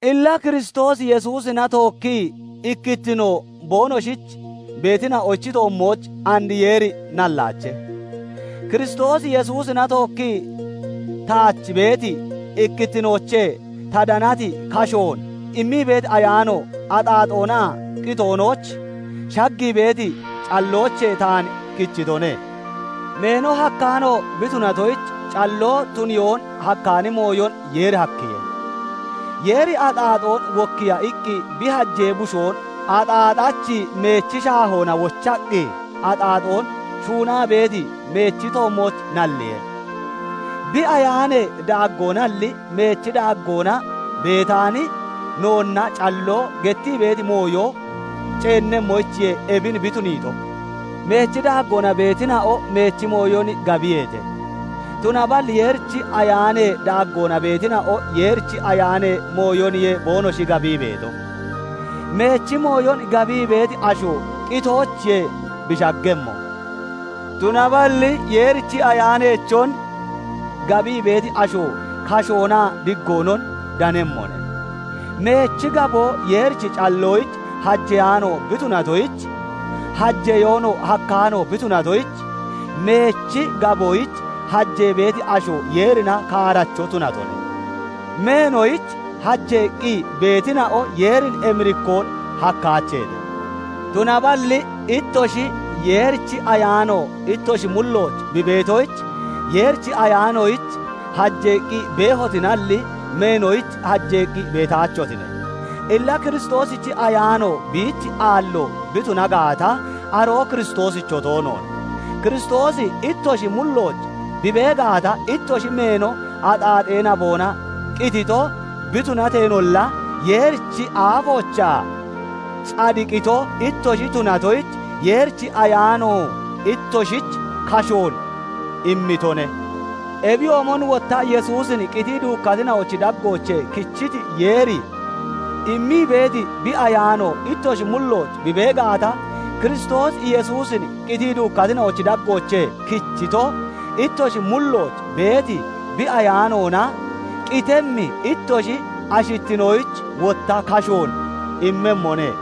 Illa Kiristoos Yesuusina tookkii ikkittino boonoshich beetina'ochi toommooch and Yeeri nallaache. Kiristoos Yesuusina tookkii taach beeti ikkittinoochee ta danati kashoon immii beeti Ayaano axaaxoonaa qitoonooch shaggii beeti calloochee taan kichitone. Meeno hakkaano bi tunatoyich calloo tuniyoon hakkaani mooyon Yeeri hakkiye; Yeeri axaaxoon wokkiiya iqqi bi hajee Bushoon axaaxachi meechi shaahoona wochaqqi, axaaxoon shuunaa beeti meechi toommooch nalliye. Bi Ayaanee daaggoonalli, meechi daaggoona beetaani noonna calloo gettii beeti mooyo ceennemmoyichiye ebin bi tuniito. Meechi daaggoona beetina'o meechi mooyon gabiyeete; tunaballi Yeerichi Ayaanee daaggoona beetina'o Yeerichi Ayaanee mooyoniye boonoshi gabii beeto. Meechi mooyon gabii beeti asho qitoochiye bi shaggemmo, tunaballi Yeerichi Ayaaneechon gabii beeti asho kashoonaa diggoonon danemmone. Meechi gaboo Yeerichi calloyich hajeyaano bi tunatoyich, hajeyoonoo hakkaano bi tunatoyich, meechi gaboyich hajee beeti asho Yeerina kaaracho tunatone. Meenoyich hajeeqqi beetina'o Yeerin emirikkoon hakkaacheete. Tunaballi ittoshi, Yeerichi Ayaano ittoshi mullooch bi beetoyich, Yeerichi Ayaanoyich hajeeqqi beehotinalli, meenoyich hajeeqqi beetaachotine. Illa Kiristoosichi Ayaano biich aallo bi tuna gaata, aroo Kiristoosicho toonoone. Kiristoosi ittoshi mullooch bi bee gaata, ittoshi meeno axaaxee naboona qitito bi tunateenolla, Yeerichi aafoochaa cadiqito ittoshi tunatoyich, Yeerichi Ayaano ittoshich kashoon immitone. Ebiyoomon wotta Yesuusin qitii duukkatina'ochi daggoochee kichiti Yeeri immii beeti bi Ayaano ittoshi mullooch bi bee gaata, Kiristoos Yesuusin qitii duukkatina'ochi daggoochee kichito, ittoshi mullooch beeti bi Ayaanoona qitemmi ittoshi ashittinoyich wotta kashoon immemmone.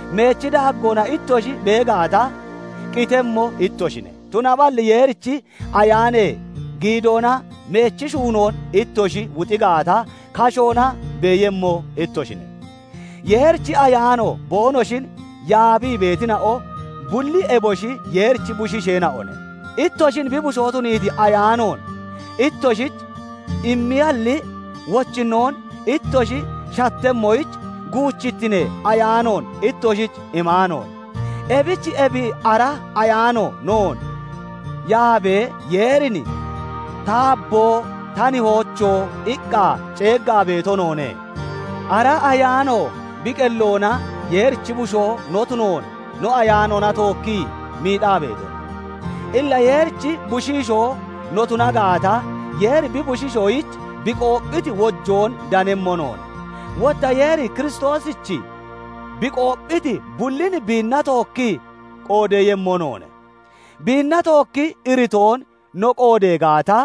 Meechi daaggoona ittoshi bee gaata, qitemmo ittoshine; tunaballi Yeerichi Ayaanee giidoona meechi shuunoon ittoshi wuxi gaata, kashoona beeyemmo ittoshine. Yeerichi Ayaano boonoshin yaabii beetina'o bulli eboshi Yeerichi bushiisheena'one. Ittoshin bi bushoo tuniiti Ayaanoon ittoshich immiyalli, wochinnoon ittoshi shattemmoyich guuchittinee ayaanoon ittoshich imaanoone; ebich ebi ara Ayaano noon yaabee, Yeerin "Taabo! Ta Nihoocho!" iqqa ceeggaa beeto noone. Ara Ayaano bi qelloona Yeerichi bushoo no tunoon no ayaanoona tookkii miixaa beetone. Illa Yeerichi bushiishoo no tuna gaata, Yeeri bi bushiishoyich bi qoopphiti wojoon danemmo noone; wotta Yeeri Kiristoosich bi qoopphito bullin biinna tookki qoodeeyemmo noone; biinna tookkii iritoon no qoodee gaata,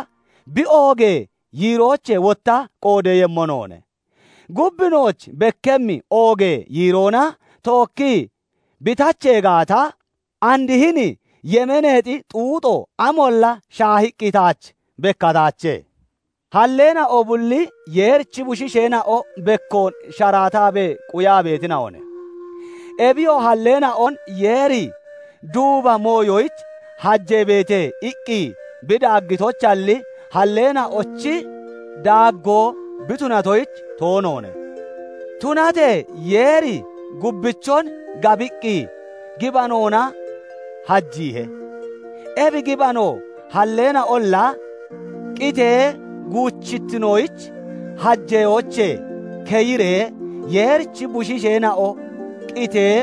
bi oogee yiiroochee wotta qoodeeyemmo noone. Gub nooch bekkemmi oogee yiiroona tookkii bi tachee gaata, andi hini yemeeneexi xuuxo amolla shaahiqqi taach bekkataache. Halleena'o bulli Yeerichi bushiisheena'o bekkoon sharaataabee quyaa beetina'one. Ebiyoo halleena'on Yeeri "Duuba mooyoyich hajeebeete!" iqqi bi daaggitoyichalli, halleena'ochi daaggoo bi tunatoyich toonoone; tunatee Yeeri gubbichon gabiqqi gibanoona hajiihe. Ebi gibanoo halleena'olla qitee guuchittinoyich hajeyoochee keyiree, Yeerichi bushiisheena'o qitee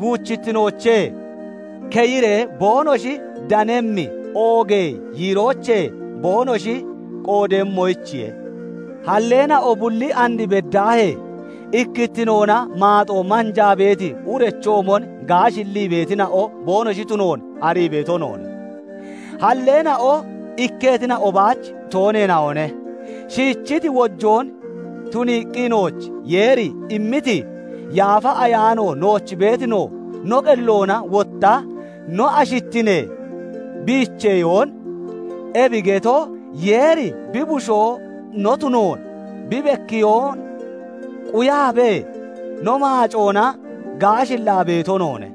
guuchittinoochee keyiree boonoshi danemmi oogee yiiroochee boonoshi qoodeeyemmoyichiye. Halleena'o bulli and beddaahee ikkittinoona maaxoo manjaa beeti urechoomon gaashillii beetina'o boonoshi tunoon arii beeto noone. Halleena'o ikketina'o baach tooneena'one; shiichiti wojoon tuniiqqi nooch Yeeri immiti Yaafa Ayaano nooch beeti no, no qelloona wotta no ashittinee biicheyoon, ebi getoo Yeeri bi bushoo no tunoon bi bekkiyoon quyaabee, no maacoona gaashillaa beeto noone.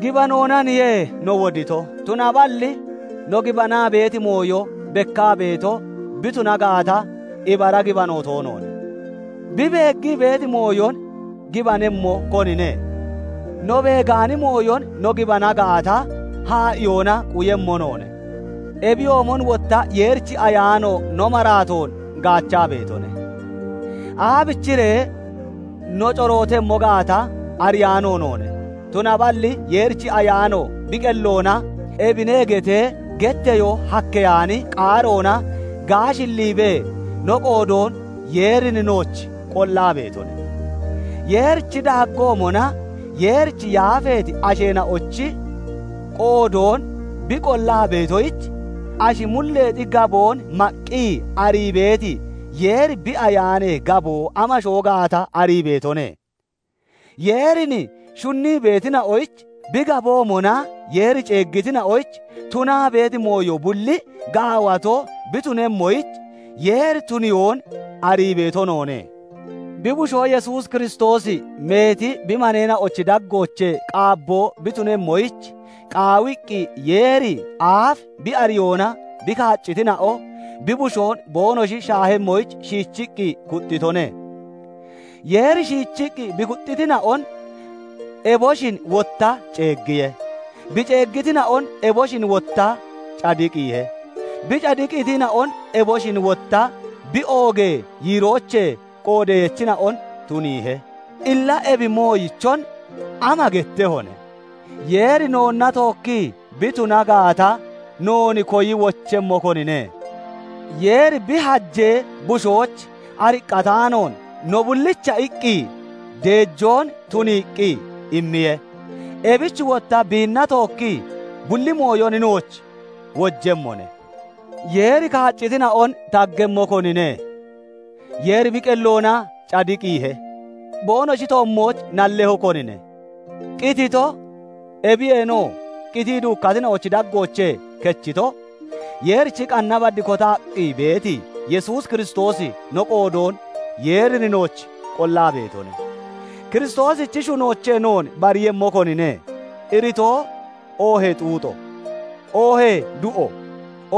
Gibanoonaniye no wodito; tunaballi no gibanaa beeti mooyo bekkaa beeto bi tuna gaata, ibara gibano toonoone. Bi beeggii beeti mooyon gibanemmo konine? No beegaani mooyon no gibana gaata, haa'iyoona quyemmo noone. Ebiyoomon wotta Yeerichi Ayaano no maraatoon gaachaa beetone; aabichiree no corootemmo gaata ariyaano noone; tunaballi Yeerichi Ayaano bi qelloona "Ebine" getee getteyoo hakkeyaani qaaroona gaashilliibee no qoodoon Yeerin nooch qollaa beetone. Yeerichi daaggoomona Yeerich yaafeeti asheena'ochi qoodoon bi qollaa beetoyich, ashi mulleexi gaboon maqqi arii beeti Yeeri bi Ayaanee gaboo amasho gaata arii beetone. Yeerin shunnii beetina'oyich, bi gaboomona Yeeri ceeggitina'oyich tunaa beeti mooyo bulli gaawato bi tunemmoyich Yeeri tuniyoon arii beeto noone. Bi Bushoo Yesuus Kiristoosi meeti bi maneena'ochi daggoochee qaabboo bi tunemmoyich, qaawiqqi, Yeeri aafi bi ariyoona bi kaaccitina'o bi Bushoon boonoshi shaahemmoyich shiichiqqi kuxxitone. Yeeri shiichiqqi bi kuxxitina'on eboshin wotta ceeggiye; bi ceeggitina'on eboshin wotta cadiqiihe; bi cadiqiitina'on eboshin wotta bi oogee yiiroochee qoodeyachina'on tuniihe. Illa ebi mooyichon ama gettehone? Yeeri noonna tookkii bi tuna gaata, noon koyi wochemmo konine? Yeeri bi hajee Bushoyich ariqqataanoon no bullicha iqqi deejoon tuniiqqi immiye; ebich wotta biinna tookki bulli mooyon nooch wojemmone. Yeeri kaaccitina'on taggemmo konine? Yeeri bi qelloona cadiqiihe. Boonoshi toommooch nallemmo konine? Qitito, ebiyeenoo qitii duukkatina'ochi daggoochee kechito, Yeerichi qanna bad kotaqqi beeti Yesuus Kiristoosi no qoodoon Yeerin nooch qollaa beetone. Kiristoosichi shunoochee noon bariiyemmo konine? Iritoo, oohee xuuxo, oohee du'o,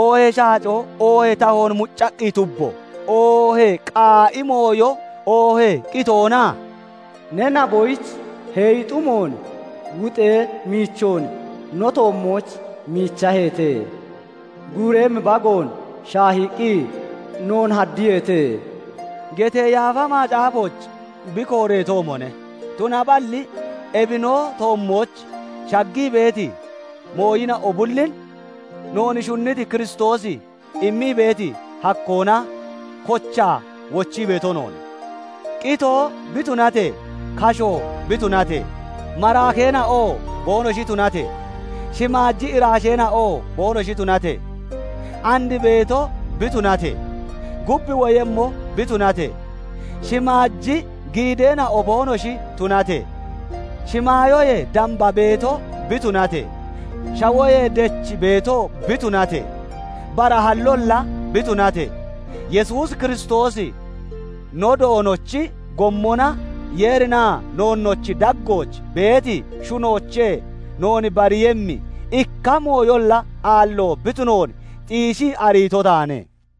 oohee shaacoo, oohee tahoon muccaqqi tubbo, oohee qaa'i mooyo, oohee qitoona? "Ne naboyich heeyi xumoon wuxee miichoon no toommooch miichaheete; Guureeyemmi bagoon shaahiiqqi noone haddiyeete" getee Yaafa Macaafooch bi kooreetoomone. Tunaballi ebi no toommooch shaggii beeti mooyina'o bullin noon shunniti Kiristoosi immii beeti hakkoona kochaa wochii beeto noone. Qitoo bi tunatee, kashoo bi tunatee, maraakeena'oo boonoshi tunatee, shimaaji iraasheena'oo boonoshi tunatee, and beeto bi tunatee, gub woyemmo bi tunatee, shimaaji giideena'o boonoshi tunatee, shimaayoyee damba beeto bi tunatee, shawoyee dech beetoo bi tunatee, bara hallolla bi tunatee, Yesuus Kiristoosi no Doonochi gommona Yeerinaa noonnoochi daggooch beeti shunoochee noon bariiyemmi ikka mooyolla aallo bi tunoon xiishii ariito taane.